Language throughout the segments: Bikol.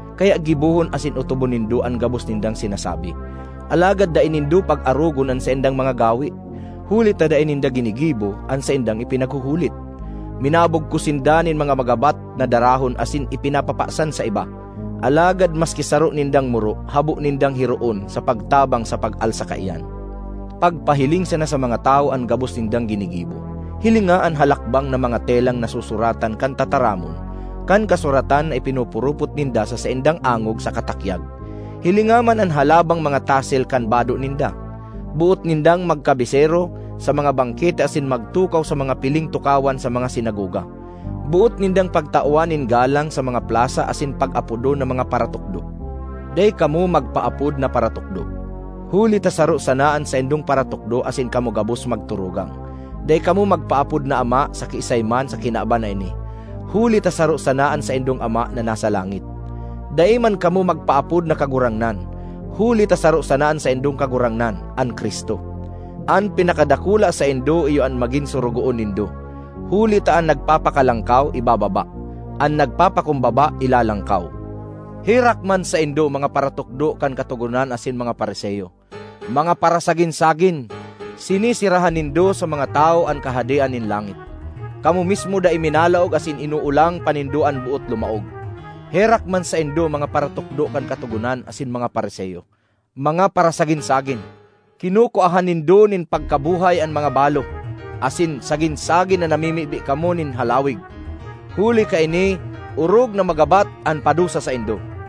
Kaya gibohon asin otobon nindo an gabos nindang sinasabi; alagad dai nindo pag-arogon an saindang mga gawe, huli ta dai ninda ginigibo an saindang ipinaghuhulit. Minabugkos sinda nin mga magabat na darahon asin ipinapapasan sa iba, alagad maski saro nindang muro habo nindang hiroon sa pagtabang sa pag-alsa kaiyan. Pagpahiling sana sa mga tawo an gabos nindang ginigibo. Hilinga an halakbang na mga telang nasusuratan kan tataramon kan kasuratan na ipinupurupot ninda sa saindang angog saka takyag. Hilinga man an halabang mga tasel kan bado ninda! Boot nindang magkabesero sa mga bangkete asin magtukaw sa mga piling tukawan sa mga sinagoga; boot nindang pagtawan nin galang sa mga plasa asin pag-apodon na mga ‘Paratukdo.’ Dai kamo magpaapod na ‘Paratukdo,’ huli ta saro sana an saindong Paratukdo asin kamo gabos magturugang. Dai kamo magpaapod na ‘Ama’ sa kiisay man sa kinaban na ini, huli ta saro sana an saindong Ama, na nasa langit. Dai man kamo magpaapod na ‘Kagurangnan,’ huli ta saro sana an saindong Kagurangnan, an Cristo. An pinakadakula saindo iyo an magin sorogoon nindo. Huli ta an nagpapakalangkaw, ibababa; an nagpapakumbaba, ilalangkaw. ”Herak man saindo, mga paratukdo kan Katogonan asin mga Fariseo! Mga parasagin-sagin! Sineserahan nindo sa mga tawo an Kahadean nin langit. Kamo mismo dai minalaog asin inoolang pa nindo an boot lumaog! (”Herak man saindo, mga paratukdo kan Katogonan asin mga Fariseo! Mga parasagin-sagin! Kinukuahan nindo nin pagkabuhay an mga balo, asin sagin-sagin na namimibi kamo nin halawig. Huli kaini, orog na magabat an padusa saindo!)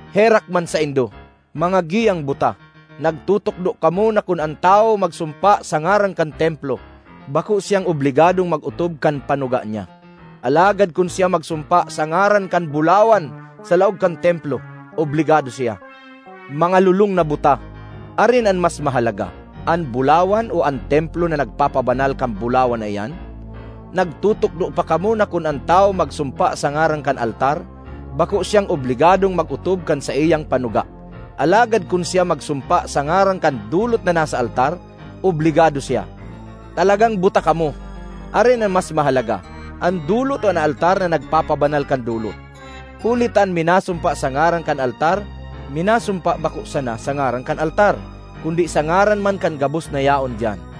”Herak man saindo, mga giyang buta! Nagtutukdo kamo na kun an tawo magsumpa sa ngaran kan Templo, bako siyang obligadong mag-otob kan panuga niya; alagad kun siya magsumpa sa ngaran kan bulawan sa laog kan Templo, obligado siya. Mga lolong na buta! Arin an mas mahalaga, an bulawan o an Templo na nagpapabanal kan bulawan na iyan? Nagtutukdo pa kamo na kun an tawo magsumpa sa ngaran kan altar, bako siyang obligadong mag-otob kan saiyang panuga; alagad kun siya magsumpa sa ngaran kan dolot na nasa altar, obligado siya. Talagang buta kamo! Arin an mas mahalaga, an dolot o an altar na nagpapabanal kan dolot? Huli ta an minasumpa sa ngaran kan altar, minasumpa bako sana sa ngaran kan altar kundi sa ngaran man kan gabos na yaon diyan.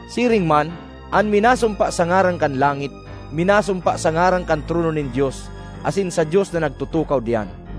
Siring man, an minasumpa sa ngaran kan langit, minasumpa sa ngaran kan trono nin Dios asin sa Dios na nagtutukaw diyan.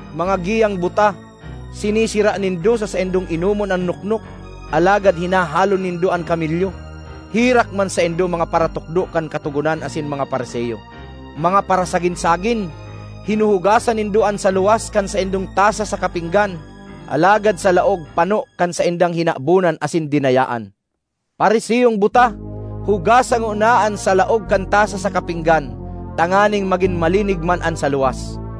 Mga giyang buta! Sinesera nindo sa saindong inomon an noknok, alagad hinahalon nindo an kamelyo! ”Herak man saindo, mga paratukdo kan Katogonan asin mga Fariseo! Mga parasagin-sagin! Hinuhugasan nindo an sa luwas kan saindong tasa saka pinggan, alagad sa laog pano kan saindang hinabonan asin dinayaan. Fariseong buta! Hugasa ngona an sa laog kan tasa saka pinggan, tanganing magin malinig man an sa luwas!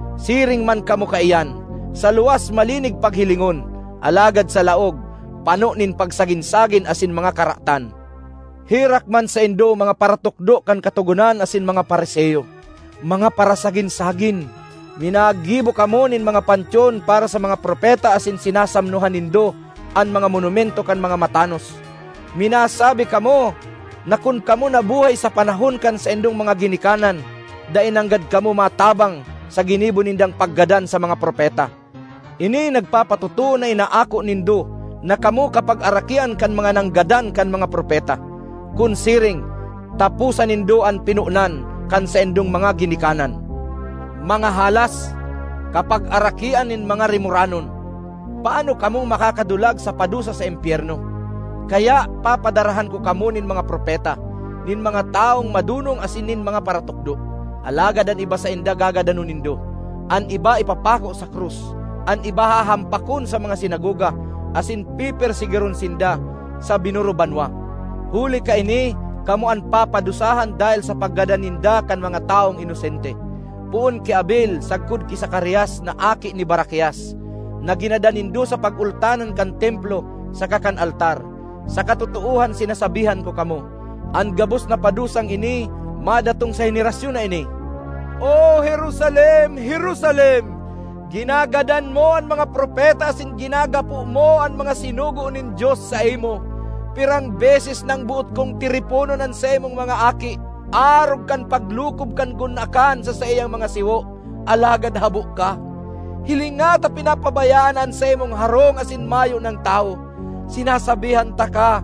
Siring man kamo kaiyan, sa luwas malinig paghilingon, alagad sa laog pano nin pagsagin-sagin asin mga karatan. ”Herak man saindo, mga paratukdo kan Katogonan asin mga Fariseo! Mga parasagin-sagin! Minagibo kamo nin mga pantyon para sa mga propeta asin sinasamnohan nindo an mga monumento kan mga matanos. Minasabi kamo na kun kamo nabuhay sa panahon kan saindong mga ginikanan, dai nanggad kamo matabang sa ginibo nindang paggadan sa mga propeta. Ini nagpapatotoo na inaako nindo na kamo kapagarakian kan mga nanggadan kan mga propeta! Kun siring, taposa nindo an pinonan kan saindong mga ginikanan! Mga halas! Kapagarakian nin mga rimoranon! Paano kamong makakadulag sa padusa sa impyerno? Kaya papadarahan ko kamo nin mga propeta, nin mga tawong madonong asin nin mga paratukdo. Alagad an iba sainda gagadanon nindo, an iba ipapako sa krus, an iba hahampakon sa mga sinagoga, asin pepersegiron sinda sa binurubanwa. Huli kaini kamo an papadusahan dahel sa paggadan ninda kan mga tawong inosente, poon ki Abel sagkod ki Zacarias na aki ni Barakias, na ginadan nindo sa pagultanan kan Templo saka kan altar. Sa katotoohan sinasabihan ko kamo, an gabos na padusang ini madatong sa henerasyon na ini! ”O Jerusalem, Jerusalem! Ginagadan mo an mga propeta asin ginagapo mo an mga sinugo nin Dios saimo! Pirang beses nang boot kong tiriponon an saimong mga aki, arog kan paglukob kan gunakan sa saiyang mga siwo, alagad habo ka! Hilinga ta pinapabayaan na an saimong harong asin mayo nang tawo. Sinasabihan taka,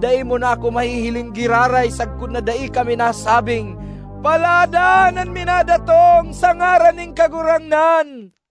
dai mo na ako mahihiling giraray sagkod na dai ka minasabing, ‘Paladan an minadatong sa ngaran nin Kagurangnan.’”